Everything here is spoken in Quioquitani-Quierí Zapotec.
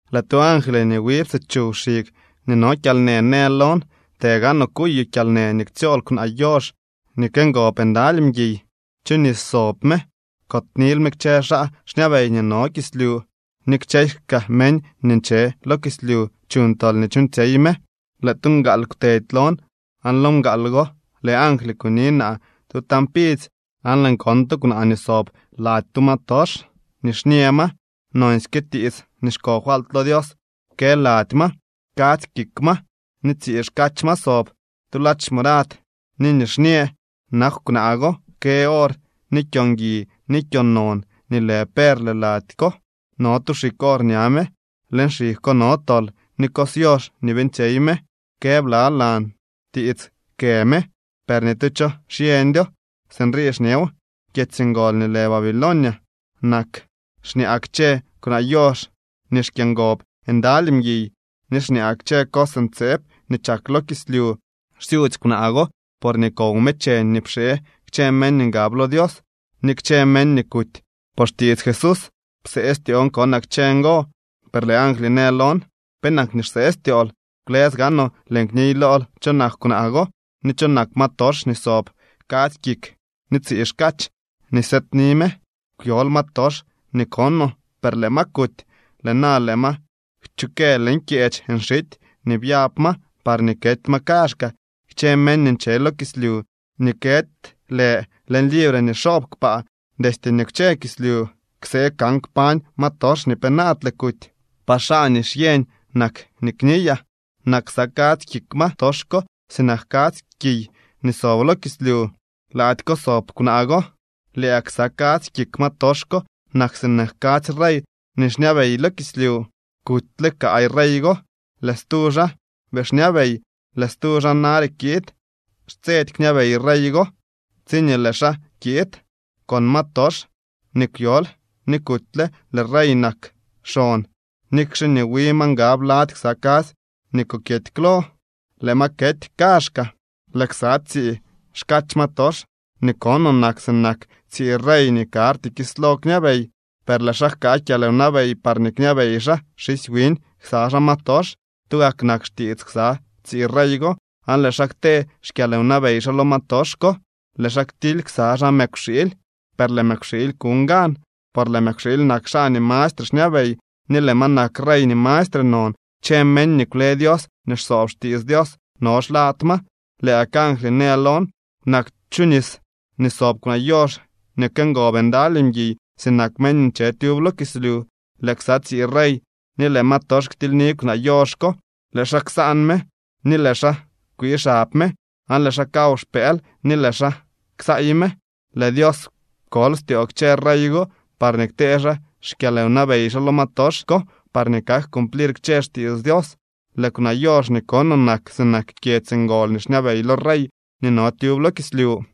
Lëë tu angly nii wi psichuw xig nii no kyalnë në lon: —Të gaanoo kuyoo kyalnë nii ktsyool kwnaa yox nii këngob ndaly mguiy, chu nis sob me. Kotnil me kchë xaa xñabey nii no kislyu ni kchësy kaa meñ nii nche lo kislyu chuñ tol nii chuuñtsyey me. Lëë tu mgaal kwtedy lon aan lo mgaal go lëë angly kuni naa tu tañ pidzy aan lëën kon tu kwnaa nii sob lady tu ma tox, nixñë ma, nonsyke tiits nii xko falt lo Dios kë lady ma, kadzy kik ma ni tsii xkach ma sob. Tu ladx morad ni nixñë nakw kwnaa go, kë or ni kyo ngui ni kyo non nii lë perle laady ko. No tu xig or ña me, leñ xig ko no tol ni cos yox nii beeñtsyey me. Kë blalan tiits kë me, per ni tu cho xyeñdyo. Sinrii xñeew: “Kyedzy ngol nii lë Babilonia nak xñaa kchë kwnaa yox nii xkyëngob ndaly mguiy ni xñaa kchë cos ntseeb nii chak lo kislyu.” Xsyudzy kwnaa go porñee kow me cheñ nii pxee kchë meñ nii ngab lo Dios ni kchë meñ nii kuty por xtiits Jesús. Psee styoon konaa kchë ngo. Per lëë angly në lon: —¿Penak nii xsee styool? Kwlës gaanoo lëën kniy lool cho nak kwnaa go, ni cho nak ma tox nii sob kadzy kik ni tsii xkach nii sëëdni me. Kwyol ma tox nii konoo, per lëë ma kuty. Lëë na lëë ma kchukë leñ kyeech nxity nii byab ma parñee kety ma kaazhkaa. Kchë meñ nii nche lo kislyu nii këdy lë leñ libre nii xoob kpaa destye nii kwche kislyu, ksee kan kpañ ma tox nii penaadle kuty. ’Par xaa nii xyeñ nak nii kniyaa: Nak ksa kadzy kik ma tox ko sinak kadzy kiy nii sob lo kislyu. Laady ko sob kwnaa go. Lëë gak ksa kadzy kik ma tox ko nak sinak kadzy rey nii xñabey lo kislyu. Kutyle kaay rey go, lëë stu xaa bii xñabey, lëë stu xaa nare kiid. Xtsedy kñabey rey go tsiñee lëë xaa kiid. Con ma tox nii kwyol ni kutyle lëë rey nak xon, nikxe nii wi ma ngab lady ksa kadzy nii kokyety klo. Lëë ma kety kaazhkaa. ’Lëë ksa tsii xkach ma tox nii konoo nak sinak tsii rey nii karty kislo kñabey, per lëë xaa jkaa kyalwnabey parñee kñabey xaa xisy wiñ ksa xaa ma tox. Tugak nak xtiits ksa tsii rey go aan lëë xaa ktee xkyalwnabey xaa lo ma tox ko. Lëë xaa ktily ksa xaa mëkwxiily, per lëë mëkwxiily kuñ gan, por lëë mëkwxiily nak xaa nii mastre xñabey ni lëë ma nak rey nii mastre non. Kchë meñ nii kwle Dios ni xsoob xtiits Dios no xlad ma. Lëë gak angly në lon: —Nak chu nis nii sob kwnaa yox nii këngob ndaly mguiy sinak meñ nii nche tyub lo kislyu. Lëë ksa tsii rey ni lëë ma tox ktilyni kwnaa yox ko. Lëë xaa ksaan me ni lëë xaa kwii xab me, aan lëë xaa kaw xpëël ni lëë xaa ksaay me. Lëë Dios pkol styoo kchë rey go parñee ktee xaa xkyalwnabey xaa lo ma tox ko parñee kak cumplir kchë xtiits Dios. Lëë kwnaa yox nii konoo nak sinak kyedzy ngol nii xñabey lo rey nii no tyub lo kislyu.